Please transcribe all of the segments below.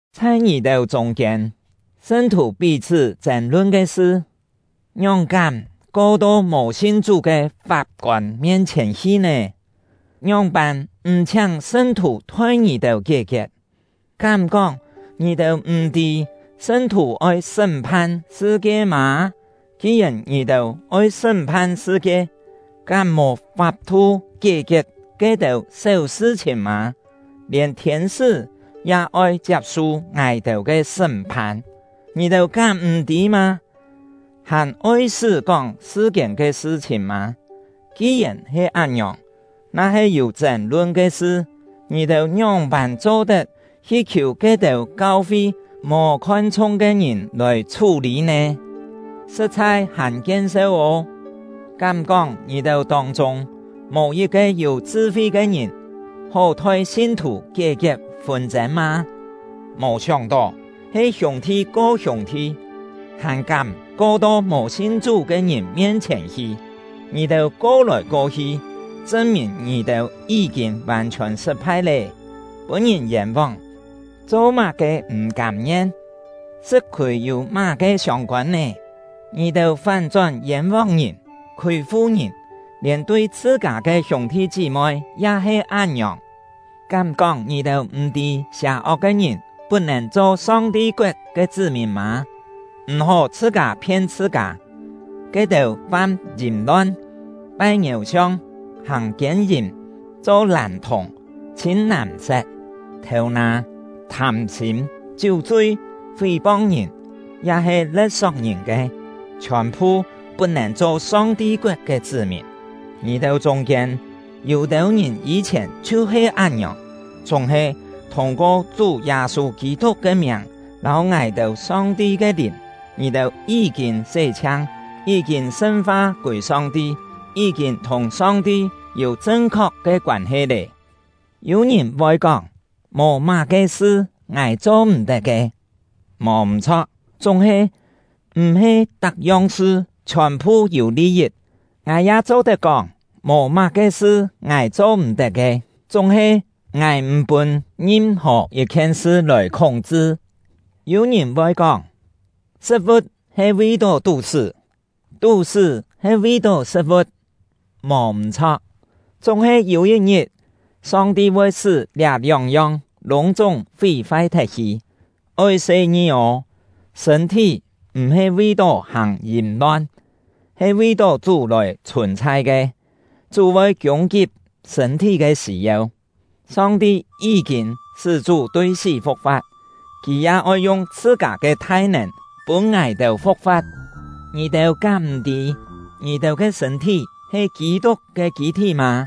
Chhai ngì-têu chûng-kiên, sṳn-thù pí-chhṳ́ chên-lun ke sṳ, ngióng-kám ko to mò sin Chú ke fap-kôn mien-chhièn hi nè? Ngióng-pân m̀ chhiáng sṳn-thù thoi ngì-têu kié-kiet? Kám-kóng ngì-têu m̀-tî sṳn-thù oi sṳ́m-phan sṳ-kie mâ? Ki-yèn ngì-têu oi sṳ́m-phan sṳ-kie, kám mò fap-thu kié-kiet ke-têu séu sṳ-chhìn mâ? Lièn thiên-sṳ́ ya oi chiap-su ngài-têu ke sṳ́m-phan, ngì-têu kám m̀-tî mâ? Hàn oi-sṳ́ kóng sṳ-kiên ke sṳ-chhìn mâ? Ki-yèn he án-ngiòng, na-he yû chên-lun ke sṳ, ngì-têu ngióng-pân cho-tet hi khiù ke-têu kau-fi mò khon-chhung ke ngìn lòi chhú-lî nè? Sṳ̍t-chhai hàn kien-seu ô! Kám-kóng ngì-têu tông-chûng mò yit-ke yû chṳ-fi ke ngìn hó thoi sin-thù kié-kiet fûn-chên mâ? Mò sióng-tó, he hiûng-thi ko hiûng-thi, hàn kám ko to mò sin Chú ke ngìn mien-chhièn hi! Ngì-têu ko-lòi ko-hi, chṳn-mìn ngì-têu yí-kîn vàn-chhiòn sṳt-phai lé. Pûn-ngìn yên-vóng, cho-má-ke m̀ kâm-ngien? Sṳ̍t-khûi yû má-ke siông-kôn nè? Ngì-têu fán-chón yên-vóng ngìn, khûi-fu ngìn, lièn tui chhṳ-kâ ke hiûng-thi chí-moi ya he án-ngiòng. Kám-kóng ngì-têu m̀-tî sià-ok ke ngìn put-nèn cho Song-ti koet ke chṳ́-mìn mâ? M̀-hó chhṳ-kâ phien chhṳ-kâ! Ke-têu fam yìm-lon, pai ngiéu-siong, hàng kiên-yìm, cho làn-thùng, chhîn-nàm-set, thêu-nâ, thâm-sîm, chiú-chui, fí-pong ngìn, ya-he le̍t-sok ngìn ke, chhiòn-phu put-nèn cho Song-ti koet ke chṳ́-mìn. Ngì-têu chûng-kiên, yû-têu ngìn yî-chhièn chhiu-he án-ngiòng. Chúng-he, thûng-ko Chú Yâ-sû Kî-tuk ke miàng lâu ngài-têu Song-ti ke Lìn, ngì-têu yí-kîn sé-chhiang, yí-kîn sṳn-fa kûi Song-ti, yí-kîn thùng Song-ti yû chṳn-khok ke koân-he lé. Yû ngìn voi kóng: “Mò má-ke sṳ ngài cho-m̀-tet ke!” Mò m̀-chho̍k; chúng-he, m̀-he tak-yong sṳ chhiòn-phu yû li-yit. Ngài ya cho-tet kóng: “Mò má-ke sṳ ngài cho-m̀-tet ke”, chúng-he, ngài m̀ pûn ngim-hò yit-khien sṳ lòi khúng-chṳ. Yû ngìn voi kóng: “Sṳ̍t-vu̍t he vi-tó tú-sṳ́, tú-sṳ́ he vi-tó sṳ̍t-vu̍t.” Mò m̀-chho̍k; chúng-he yû yit-ngit, Song-ti voi sṳ́ liá lióng-yong lûng-chúng fí-fai thet-hi. Oi se-ngi ô! Sṳ̂n-thí m̀-he vi-tó hàng yìm-lon, he vi-tó Chú lòi chhùn-chhai ke; Chú voi kiûng-kip sṳ̂n-thí ke sî-yeu. Song-ti yí-kîn sṳ́ Chú tui sí fu̍k-fa̍t; Kì ya oi yung chhṳ-kâ ke thai-nèn pûn ngài-têu fu̍k-fa̍t. Ngì-têu kám m̀-tî, ngì-têu ke sṳ̂n-thí he Kî-tuk ke kî-thí mâ?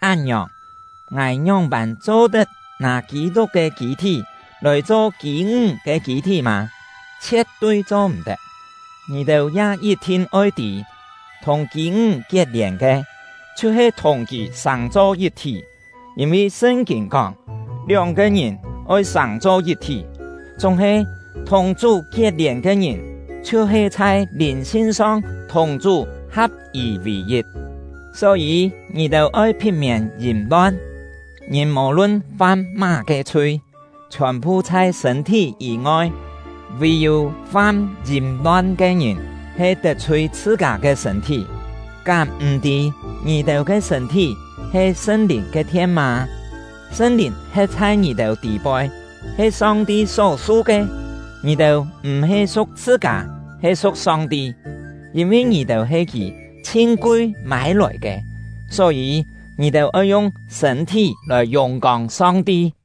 Án-ngiòng, ngài ngióng-pân cho-tet nâ Kî-tuk ke kî-thí lòi cho kî-ńg ke kî-thí mâ? Chhie̍t-tui cho-m̀-tet! Ngì-têu ya yit-thin oi tî, thùng kî-ńg kiet-lièn ke, chhiu-he thùng kì sàng-cho yit-thí. Yîn-vi Sṳn-kîn kóng: “Lióng-ke ngìn oi sàng-cho yit-thí.” Chúng-he, thùng Chú kiet-lièn ke ngìn, chhiu-he chhai lìn-sin-song thùng Chú ha̍p-yì vì-yit. Só-yî, ngì-têu oi phit-miên yìm-lon. Ngìn mò-lun fam má-ke chhui, chhiòn-phu chhai sṳ̂n-thí yî-ngoi; vì-yû fam yìm-lon ke ngìn he tet-chhui chhṳ-kâ ke sṳ̂n-thí. Kám m̀-tî ngì-têu ke sṳ̂n-thí he Sṳn-Lìn ke thien mâ? Sṳn-Lìn he̍t chhai ngì-têu tî-poi, he Song-ti só-su ke. Ngì-têu m̀-he su̍k chhṳ-kâ, he su̍k Song-ti, yîn-vi ngì-têu he Kì chhin kui mâi-lòi ke. Só-yî, ngì-têu oi yung sṳ̂n-thí lòi yùng-kông Song-ti.